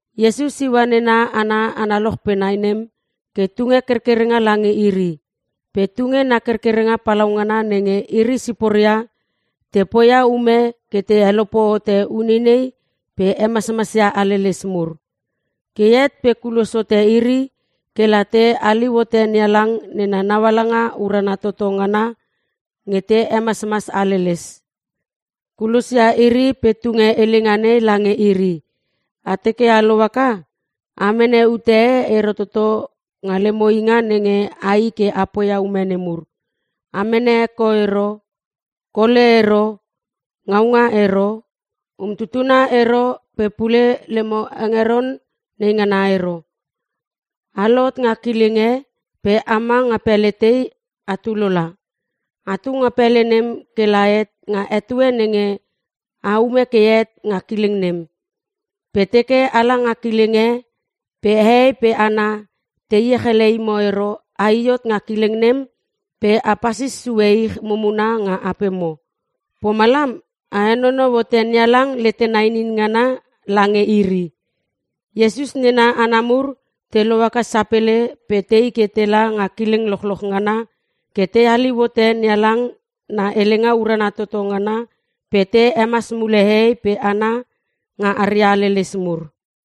Iesus iua nena hana analoch pe nai nem ke tunge kerkerenga lange iri. Pe tunge na kerkerenga palaungana nenge iri siporia te poia ume ke te helope hote uneinei pe te hemasmas ia haleles mur. Ke het pe kulos hote iri ke la te haliu hote NeHalang nena naualanga urana toto ngana pe te hemasmas haleles. Kulosia iri pe tunge helenga nei lange iri, “A teke a lohaka a mene ute e ero toto nga lemo inga nenge ai ke a poia ume nemur. A mene heko ero, kole ero, ngaunga ero, umtutuna ero pe pule lemo hengeron naingana ero. A lohot nga kileng e pe ama nga pele tei atu lola. Atu nga pele nem ke la het nga etue nenge a ume ke het nga kileng nem. Pe teke ala nga kileng e pe hehei pe hana te iech ele imo ero ai hot nga kileng nem pe a pasis sue ich mumuna nga apemo. Pomalam a henonou hote NeHalang letena inin ngana lange iri.” Iesus nena hana mur te lohaka sapele pe tei ke tela nga kileng lochloch ngana ke te haliu hote NeHalang na helenga urana toto ngana pe te hemas mule hehei pe hana nga aria haleles mur.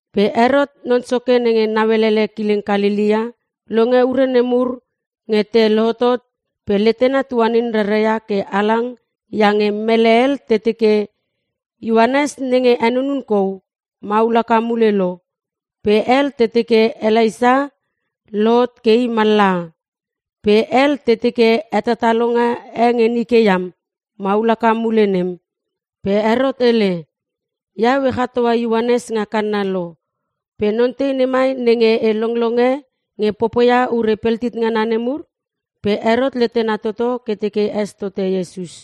Pe Herot non soke nenge nauele kileng Kalelea longe ure nemur nge te lohotot pe letena tuanin raraia ke halang iange mele hel te teke, “Ioanes nenge henunun kou maul haka mule lo!” Pe hel te teke Elaisa lohot ke i mallaha. Pe hel te teke hetatalonga e nge nike iam maul haka mule nem. Pe Herot hele, “Iau e chatoa Ioanes nga kanna lo pe non tei nemai nenge e longlonge nge popoia ure peltit ngana nemur?” Pe Herot letena toto ke teke es tote Iesus.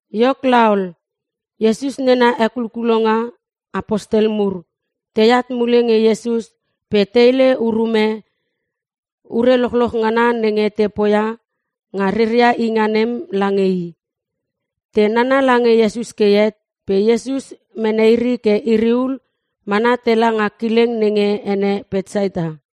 Iok laol, Iesus nena hekulkulonga (Apostel mur) teat mule nge Iesus pe te hele urume ure lochloch ngana nenge te poia nga reria inga nem lange i. Te nana lange Iesus ke het pe Iesus mene iri ke iri hul mana tela nga kileng nenge ene Petsaita.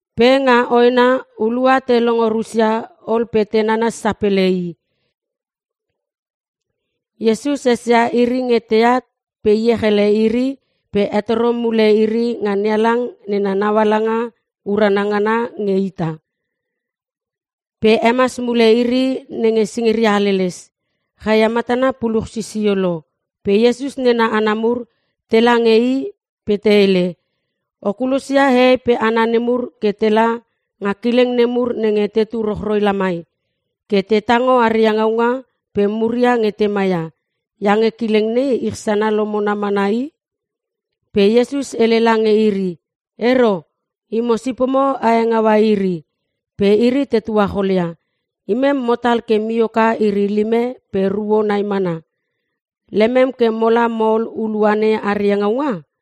Pe nga hoena hulua te longo rusia ol pe te nanas sapele i. Iesus esia iri nge teat pe iech ele iri pe hetoro mule iri nga NeHalang nena naualanga urana ngana nge ita. Pe hemas mule iri nenge singiria haleles. Chaia matana puluch sisio lo pe Iesus nena hana mur tela nge i pe te hele, “O kulosia hehei pe hana nemur ke tela nga kileng nemur nenge tetu rochroi lamai ke te tango aria ngaunga pe muria nenge te maia. Iange kileng nei ich sana lomona mana i.” Pe Iesus hele lange iri, “Ero, imo sipomo a hengaua iri.” Pe iri te tuacholia, “Imem motal ke mioka iri lime pe ruo nai mana. Lemem ke mola mo ol hulua nei aria ngaunga?”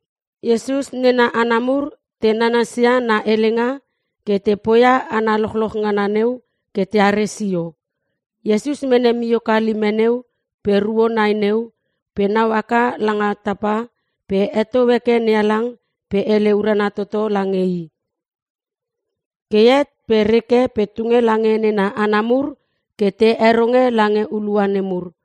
Iesus nena hana mur te nanasia na helenga ke te poia hana lochloch ngana neu ke teare sio. Iesus mene mioka lime neu pe ruo nai neu pe nau haka langa tapa pe heto heke NeHalang pe hele urana toto lange i. Ke het pe reke pe tunge lange nena hana mur ke te heronge lange hulua nemur.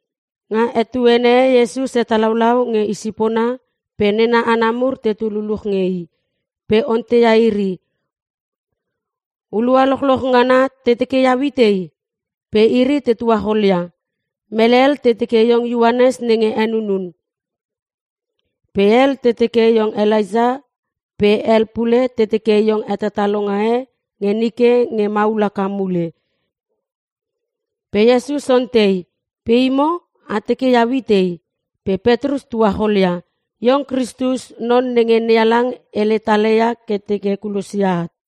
Nga etuene e Iesus hetalaulau nge isipona pe nena hana mur tetu luluch nge i. Pe onteia iri, “Hulua lochloch ngana te teke iau itei?” Pe iri te tuacholia, “Mele hel te teke iong Ioanes nenge henunun. Pe hel te teke iong Elaisa pe hel pule te teke iong hetatalonga e nge nike nge maul haka mule.” Pe Iesus ontei, “Pe imo? A teke iau itei?” Pe Petrus tuacholia, “Iong Kristus non nenge NeHalang hele tala ia ke teke kulosia at.”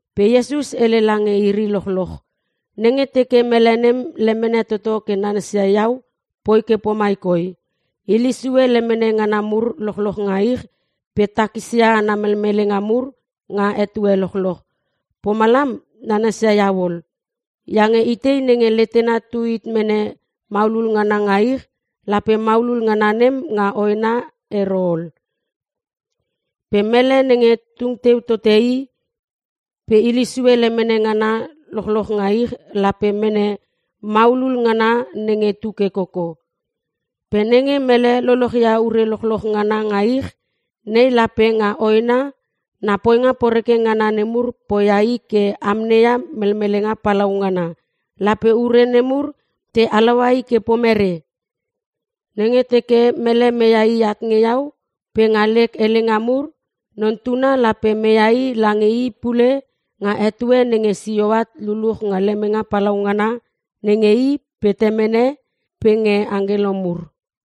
Pe Iesus hele lange iri lochloch, “Nenge teke mele nem lemene toto ke nanasia iau poi ke pomai koi; Hile sue lemene ngana mur lochloch nga ich pe takisia ana melmelenga mur nga etue lochloch. Pomalam nanasia iau ol. Iange itei nenge letena tu hit mene maulul ngana nga ich lape maulul ngana nem nga hoena ero ol. Pe mele nenge tung teu tote i pe hile sue lemene ngana mur lochloch nga ich lape mene mule maulul ngana nenge tu ke koko. Pe nenge mele lolochia ure lochloch ngana nga ich nei pe nga hoena na poinga poreke ngana mur poia i ke amneia melmelenga palaungana lape ure pa nemur te halaua i ke mere? Nenge teke mele meia i at nge iau pe nga lek helenga mur Non Tuna lape meia i lange i pule nga etue nenge sio at luluch nga lemenge palaungana nenge i pe nge Temene pe nge angkelo mur.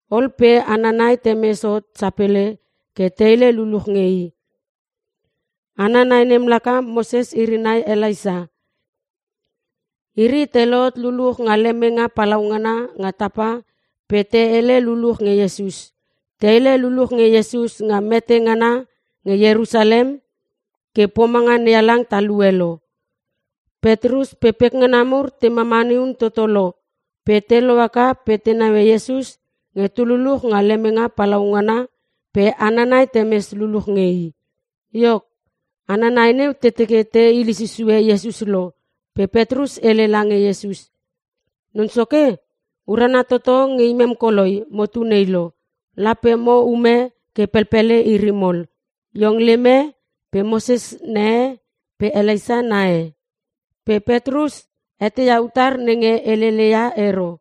Ol pe hana nai temes hot sapele ke te hele luluch nge i. Hana nai nem laka Moses iri nai Elaisa. Iri te lohot luluch nga lemenge palaungana nga tapa pe te hele luluch nge Iesus. Te hele luluch nge Iesus nga mete ngana nge Ierusalem ke pomanga NeHalang talue lo. Petrus pe pekngana mur te mamani un toto lo pe te lohaka pe te naue Iesus nge tu luluch nga lemenge palaungana pe hana nai neu temes luluch nge i. Iok, hana nai neu te teke te hile susue Iesus lo pe Petrus hele lange Iesus, “Non Soke, urana toto nge imem koloi motu nei lo. Lape mo ume ke pelpele iri mol. Iong lem e pe Moses na e pe Elaisa na e.” (Pe Petrus eteia utar nenge helele ia ero.)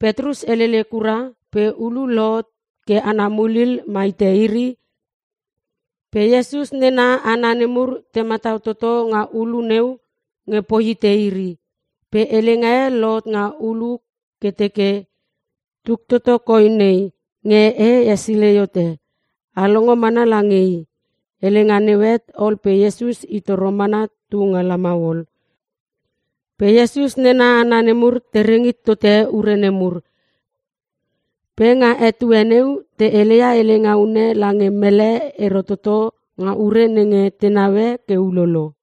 Petrus helele kura pe ulu lohot ke ana mulil ma hite iri pe Iesus nena hana nemur te matau toto nga ulu neu nge poi hite iri. Pe helenga e lohot nga ulu ke teke, “Tuk toto koi nei nge e hesilei hote. A longo mana lange i.” Helenga neu het ol pe Iesus i toro mana tu nga lamau ol. Pe Iesus nena hana nemur te reng hit tote ure nemur. Pe nga etue neu te heleia helenga unne lange mele ero toto nga ure nenge te naue ke ulolo.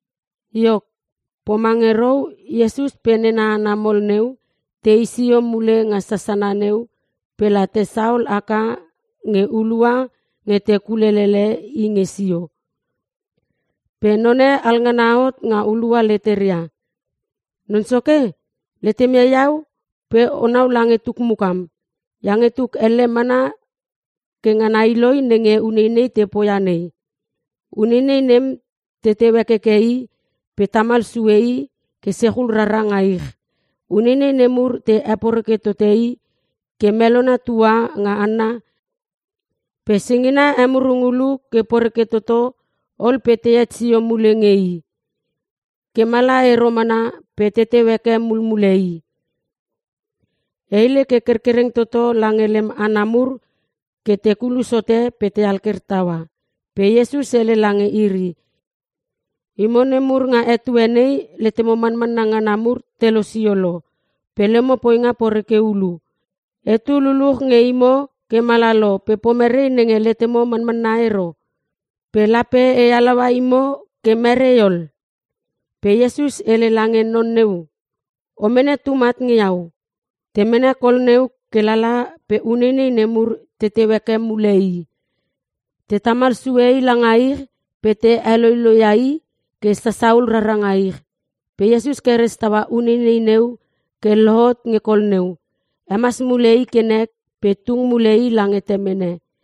Iok, pomange rou Iesus pe nena hana mol neu tei sio mule nga sasana neu pe la te saol haka nge hulua nge te kulelele i nge sio. Pe none alngana hot nga hulua leteria, “Non Soke, letem ia iau pe onau lange tuk mukam. Iange tuk elle mana ke ngana i loi nenge uneinei te poia nei. Uneinei nem teu hekeke i pe te tamal sue i ke sechul rara nga ich. Uneinei nemur te heporeke tote i ke melona tua nga hanna pe singina emurung ulu ke poreke toto ol pe tehet sio mule nge i. Ke mala ero mana pe teteu heke mulmule i. E hele ke kerkereng toto lange lem hana mur ke te kulos hote pe te alker taua.” Pe Iesus hele lange iri, “Imo nemur nga etue nei letemo manmanna ngana mur te losio lo. Pe lemo poinga poreke ulu. Etu luluch nge imo ke mala lo pe pomere nenge letemo manmanna ero? Pe lape e halaua imo ke merei ol?” Pe Iesus hele lange non neu, “O mene tum at nge iau.” Te mene kol neu ke lala pe uneinei nemur teteu haka mule i. Te tamal sue i langa ich pe te heloiloi ia i ke sasahul rara nga ich. Pe Iesus keres taua uneinei neu ke lohot nge kol neu. Hemas mule i ke nek pe tung mule i lange temene.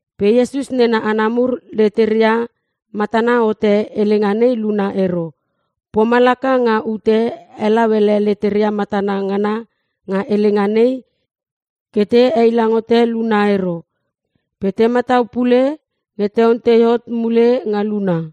Pe Iesus nena hana mur leteria matana hote helenga nei luna ero. Pomalaka nga ute helau ele leteria matana ngana nga helenga nei ke te heilang hote luna ero. Pe te matau pule nge te ontei hot mule nga luna.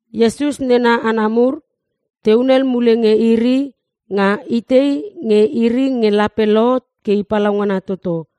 Iesus nena hana mur te hunel mule nge iri nga itei nge iri nge lape lohot ke i palaungna toto.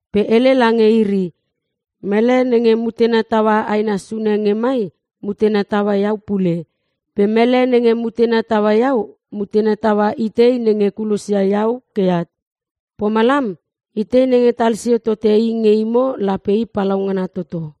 pe hele lange iri, “Mele nenge mutena taua aina sune nge mai mutena taua iau pule. Pe mele nenge mutena taua iau mutena taua itei nenge kulosia iau ke eat. Pomalam itei nenge talsio tote i nge imo lape i palaungana toto.”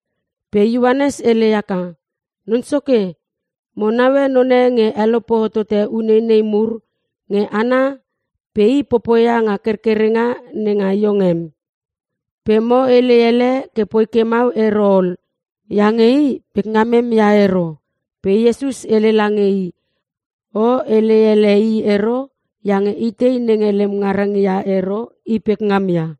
Pe Ioanes hele haka, “Non Soke, mo naue none nge helope hotote uneinei mur nge hana pe i popoia nga kerkerenga nenga iong em. Pe mo hele ele ke poi ke mau ero ol iange i pekngamem ia ero.” Pe Iesus hele lange i, “O hele ele i ero iange itei nenge lem ngarang ia ero i pekngam ia.”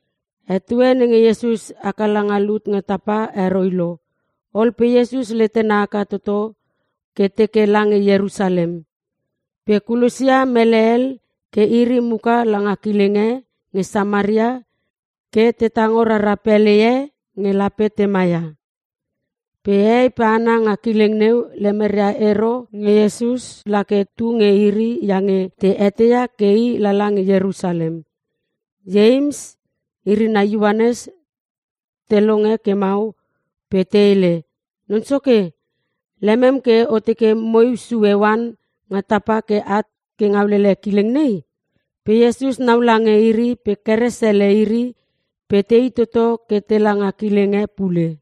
Etue nenge Iesus haka langa lut nga tapa heroi lo. Ol pe Iesus letena haka toto ke teke lange Ierusalem. Pe kulosia mele hel ke iri muka langa kileng e nge Samaria ke te tango rara pele e nge lape te maia. Pe hehei pe hana nga kileng neu lemeria ero nge Iesus la ke tu nge iri iange te eteia ke i lala nge Ierusalem. Ieims iri nai Ioanes te longe ke mau pe te hele, “Non Soke, lemem ke o teke moiu sue oan nga tapa ke at ngaulele kileng nei?” Pe Iesus nau lange iri pe keres ele iri pe tei toto ke tela nga kileng e pule.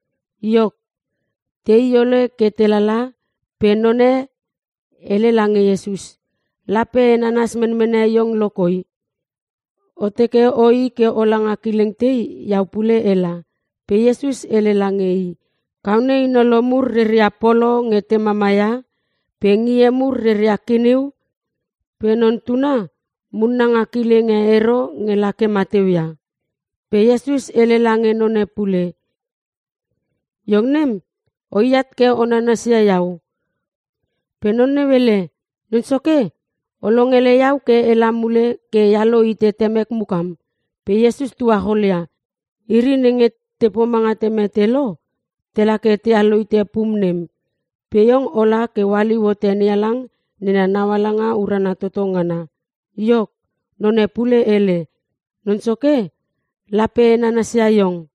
Iok, tei ole ke telala pe none hele lange Iesus, “Lape e nanas menmene iong lo koi. O teke oi ke ola nga kileng tei iau pule ela.” Pe Iesus hele lange i, “Kaone inolo mur reria polo nge te mama ia pe ngie mur reria kiniu pe Non Tuna munna nga kileng e ero nge lake mateu ia.” Pe Iesus hele lange none pule, “Iong nem o iat ke o nanasia iau.” Pe non neu hele, “Non Soke, o longele iau ke ela mule ke ealo hite temek mukam.” Pe Iesus tuacholia, “Iri nenge te pomanga te mete lo, tela ke tealo hite pum nem. Pe iong ola ke ohaliu hote NeHalang nena naualanga urana toto ngana.” Iok, none pule hele, “Non Soke, lape e nanasia iong.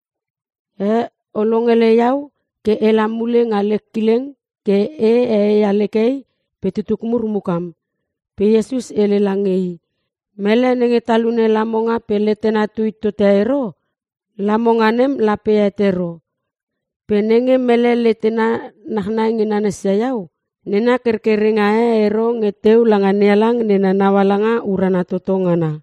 Eh, O longele iau ke ela mule nga lek kileng ke e ee ia lek hei pe tutuk mur mukam.” Pe Iesus hele lange i, “Mele nenge talune lamonga pe letena tu hit tote ero, lamonga nem lape het ero. Pe nenge mele letena nachnai nge nanasia iau, nena kerkerenga e ero nge teu langa NeHalang nena naualanga urana toto ngana.”